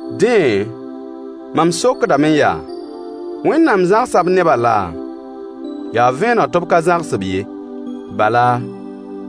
Dẽ, mam sokdame yaa: Wẽnnaam zãgsa b nebã laa? Yaa vẽeneg tɩ b ka zãgs-b ye. Bala,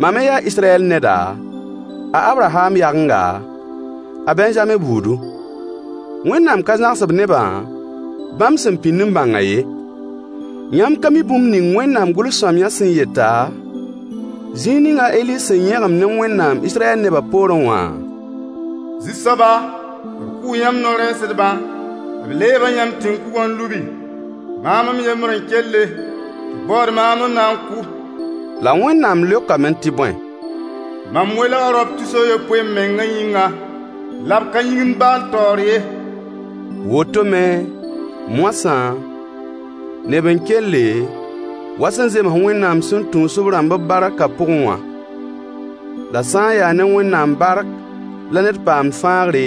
mam me yaa Israyɛl neda, a Abraham yagenga, a Bɛnzame buudu. Wẽnnaam ka zãgs b nebã bãmb sẽn pĩnd n bãngã ye. Yãmb ka mi bũmb ning Wẽnnaam gʋls-sõamyã sẽn yeta, zĩig ning a Eli sẽn yẽgem ne Wẽnnaam Israyɛl nebã poorẽ wã? Zu-soaba, b kʋʋ yãmb no-rɛɛsdbã, b leeba yãmb tẽn-kugã n lubi. Maam m yembr n kelle, tɩ b baood maam n na n kʋ. La Wẽnnaam leokame tɩ bõe? Mam welga raop tus a yopoe m mengã yĩnga, la b ka yĩgimd baal taoor ye. Woto me, moasã, neb n kelle, wa sẽn zems Wẽnnaam sẽn tũus b rãmb b barkã pʋgẽ wã. La sã n yaa ne Wẽnnaam bark la ned paamd fãagre,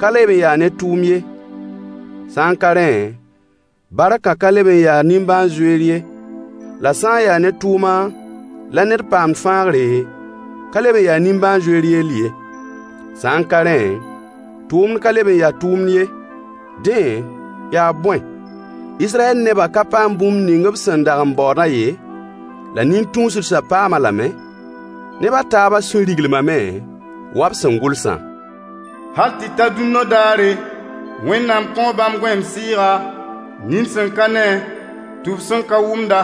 ka leb n ya ne tʋʋm ye. Sã n ka rẽ, barkã ka leb n ya nimbãan-zoeer ye [la sã n yaa ne tʋʋmã la ned paamd fãagre, ka leb n ya nimbãan-zoeer yell ye. Sã n ka rẽ, tʋʋmd ka leb n ya tʋʋmd ye.] Dẽ, yaa bõe? Israyɛl nebã ka paam bũmb ning b sẽn dag n baoodã ye, la nin-tũusdsã paam-a lame. Neb a taabã sũy riglimame, wa b sẽn gʋlsã: Hal tɩ ta dũnna daare, Wẽnnaam kõo bãmb gõeem sɩɩga, nin sẽn ka ne, tʋb sẽn ka wʋmda.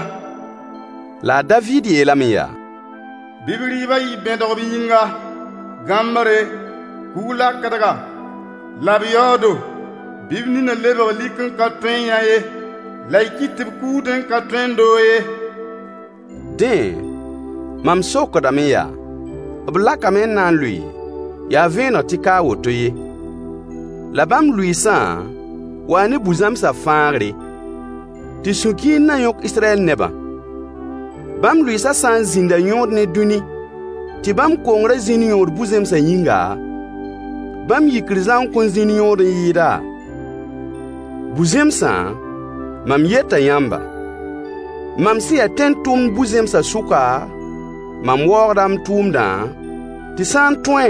La a Daviid yeelame yaa: Bɩ b rɩɩbã yɩ bẽdg b yĩnga, gãmbre, kug-lakdga, la b yaoodo. Bɩ b ninã lebg lik n ka tõe n yã ye, la y kɩt tɩ b kuudẽ n ka tõe n doog ye. Dẽ, mam sokdame yaa: B lakame n na n lʋɩ? Yaa vẽeneg tɩ ka a woto ye. La bãmb lʋɩɩsã wa ne bu-zẽmsã fãagre, tɩ sũ-kiir na yõk Israyɛl nebã. Bãmb lʋɩɩsã sã n zĩnda yõod ne dũni, tɩ bãmb kongrã zĩnd yõod bu-zẽmsã yĩnga, bãmb yikr zãng kõn zĩnd yõod n yɩɩda? Bu-zẽmsã, mam yeta yãmba: Mam sẽn ya tẽn-tʋmd bu-zẽmsã sʋka, mam waoogda m tʋʋmdã, tɩ sã n tõe,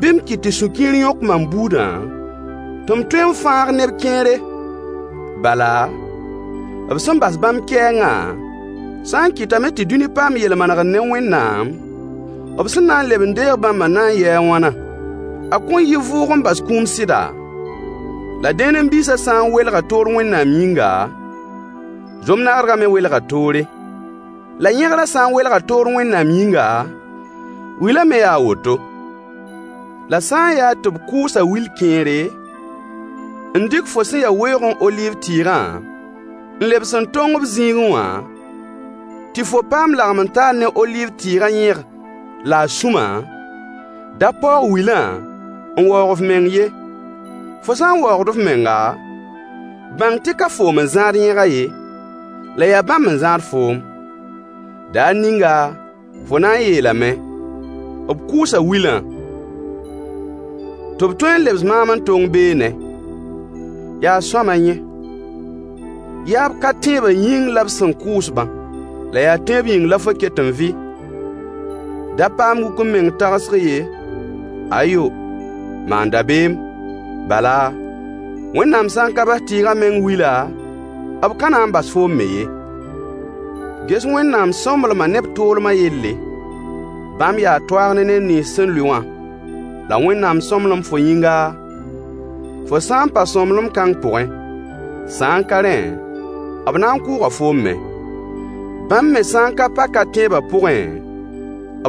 bɩ m kɩt tɩ sũ-kiir yõk mam buudã, tɩ m tõe n fãag neb kẽere. Bala, b sẽn bas bãmb kɛɛngã sã n kɩtame tɩ dũni paam yel-manegr ne Wẽnnaam, b sẽn na n leb n deeg bãmbã na n yɩɩ a wãnã? A kõn yɩ vʋʋg n bas kũum sɩda? La dẽenem biisã sã n welga toor Wẽnnaam yĩnga, zom nagdgã me welga toore. La yẽgrã sã n welga toor Wẽnnaam yĩnga, wilã me yaa a woto. La sã n yaa tɩ b kʋʋsa wil kẽere, n dɩk fo sẽn ya weoogẽ oliiv tɩɩgã n lebs n tong b zĩigẽ wã, tɩ fo paam lagem-n-taar ne oliiv tɩɩgã yẽg la a sũma, da paoog wilã n waoog f meng ye. Fo sã n waoogd f menga, bãng tɩ ka foom n zãad yẽgã ye, la yaa bãmb n zãad foom. Daar ninga fo na n yeelame: b kʋʋsa wilã, tɩ b tõe n lebs maam n tong beene. Yaa sõama yẽ. Yaa b ka-tẽebã yĩng la b sẽn kʋʋs-bã. La yaa tẽeb yĩng la fo ket n vɩ. Da paam wuk-m-meng tagsg ye, ayo, maan dabeem. Bala, Wẽnnaam sã n ka bas tɩɩgã meng wila, b ka na n bas foom me ye Ges Wẽnnaamã sõmblemã ne b toolmã yelle: Bãmb yaa toaag ne neb nins sẽn lʋɩ wã, la Wẽnnaam sõmblem fo yĩnga, fo sã n pa sõmblem-kãng pʋgẽ. Sã n ka rẽ, b na n kʋʋga foom me. Bãmb me sã ka pa ka-tẽebã pʋgẽ,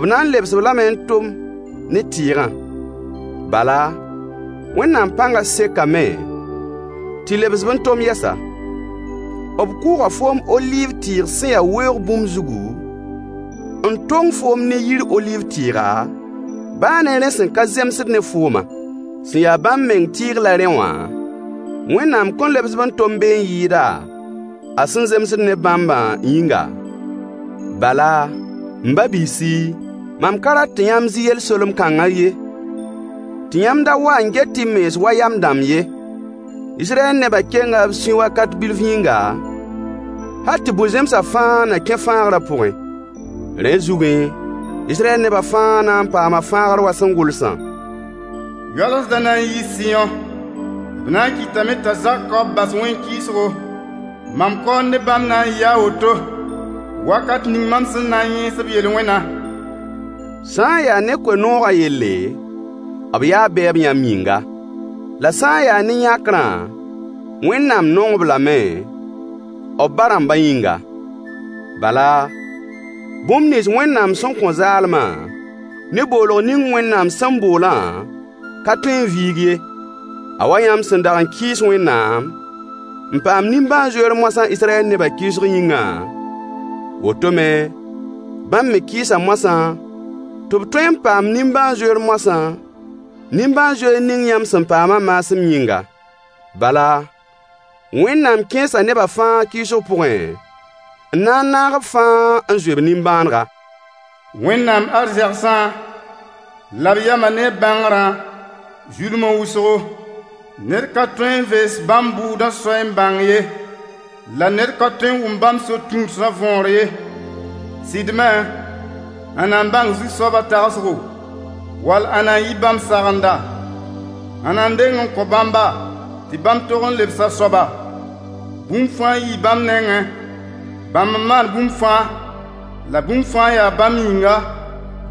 b na n lebs-b lame n tom ne tɩɩgã. Bala, Wẽnnaam pãnga sekame tɩ lebs-b n tom yɛsa. B kʋʋga foom oliiv tɩɩg sẽn ya weoog bũmb zugu, n tong foom ne yir oliiv tɩɩga, baa ne rẽ sẽn ka zemsd ne foomã. Sẽn ya bãmb meng tɩɩg la rẽ wã, Wẽnnaam kõn lebs-b n tom be n yɩɩda, a sẽn zemsd ne bãmbã yĩnga? Bala, m ba-biisi, mam ka rat tɩ yãmb zɩ yel-solem-kãngã ye, tɩ yãmb da wa n get y mens wa yam dãmb ye: Israyɛl nebã kenga b sũy wakat bilf yĩnga, hal tɩ bu-zẽmsã fãa na kẽ fãagrã pʋgẽ. Rẽ zugẽ, Israyɛl nebã fãa na n paama fãagr wa sẽn gʋlsã: Yoalsdã na n yii Sɩyõ. B na n kɩtame t'a Zakoob bas Wẽn-kɩɩsgo. Mam kaool ne bãmb na n yɩɩ a woto wakat ning mam sẽn na n yẽes b yel-wẽnã. Sã n yaa ne koe-noogã yelle, b yaa bɛɛba, yãmb yĩnga. La sã n yaa ne yãkrã, Wẽnnaam nong-b lame, b ba-rãmbã yĩnga. Bala, bũmb nins Wẽnnaam sẽn kõ zaalmã, ne boolg ning Wẽnnaam sẽn boolã ka tõe n viig ye. A wa yãmb sẽn dag n kɩɩs Wẽnnaam, n paam nimbãan-zoeer moasã Israyɛl nebã kɩɩsg yĩngã, woto me, bãmb me kɩɩsa moasã, tɩ b tõe n paam nimbãan-zoeer mosã, nimbãan-zoeer ning yãmb sẽn paamã maasem yĩnga. Bala, Wẽnnaam kẽesa nebã fãa kɩɩsg pʋgẽ, n na n naag b fãa n zoe b nimbãanega. Wẽnnaam arzẽgsã, la b yamã ne b bãngrã zulma wʋsgo. Ned ka tõe n vees bãmb bʋʋdã soɛy n bãng ye, la ned ka tõe n wʋm bãmb so-tũudsã võor ye. Sɩd me, ãnna n bãng Zu-soabã tagsgo? Wall ãnna n yɩ bãmb sagenda? Ãnna n deng n kõ bãmba, tɩ bãmb tog lebs a soaba? Bũmb fãa yii bãmb nengẽ, bãmb n maan bũmb fãa, la bũmb fãa yaa bãmb yĩnga.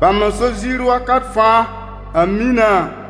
Bãmb n so ziir wakat fãa. Ãmina.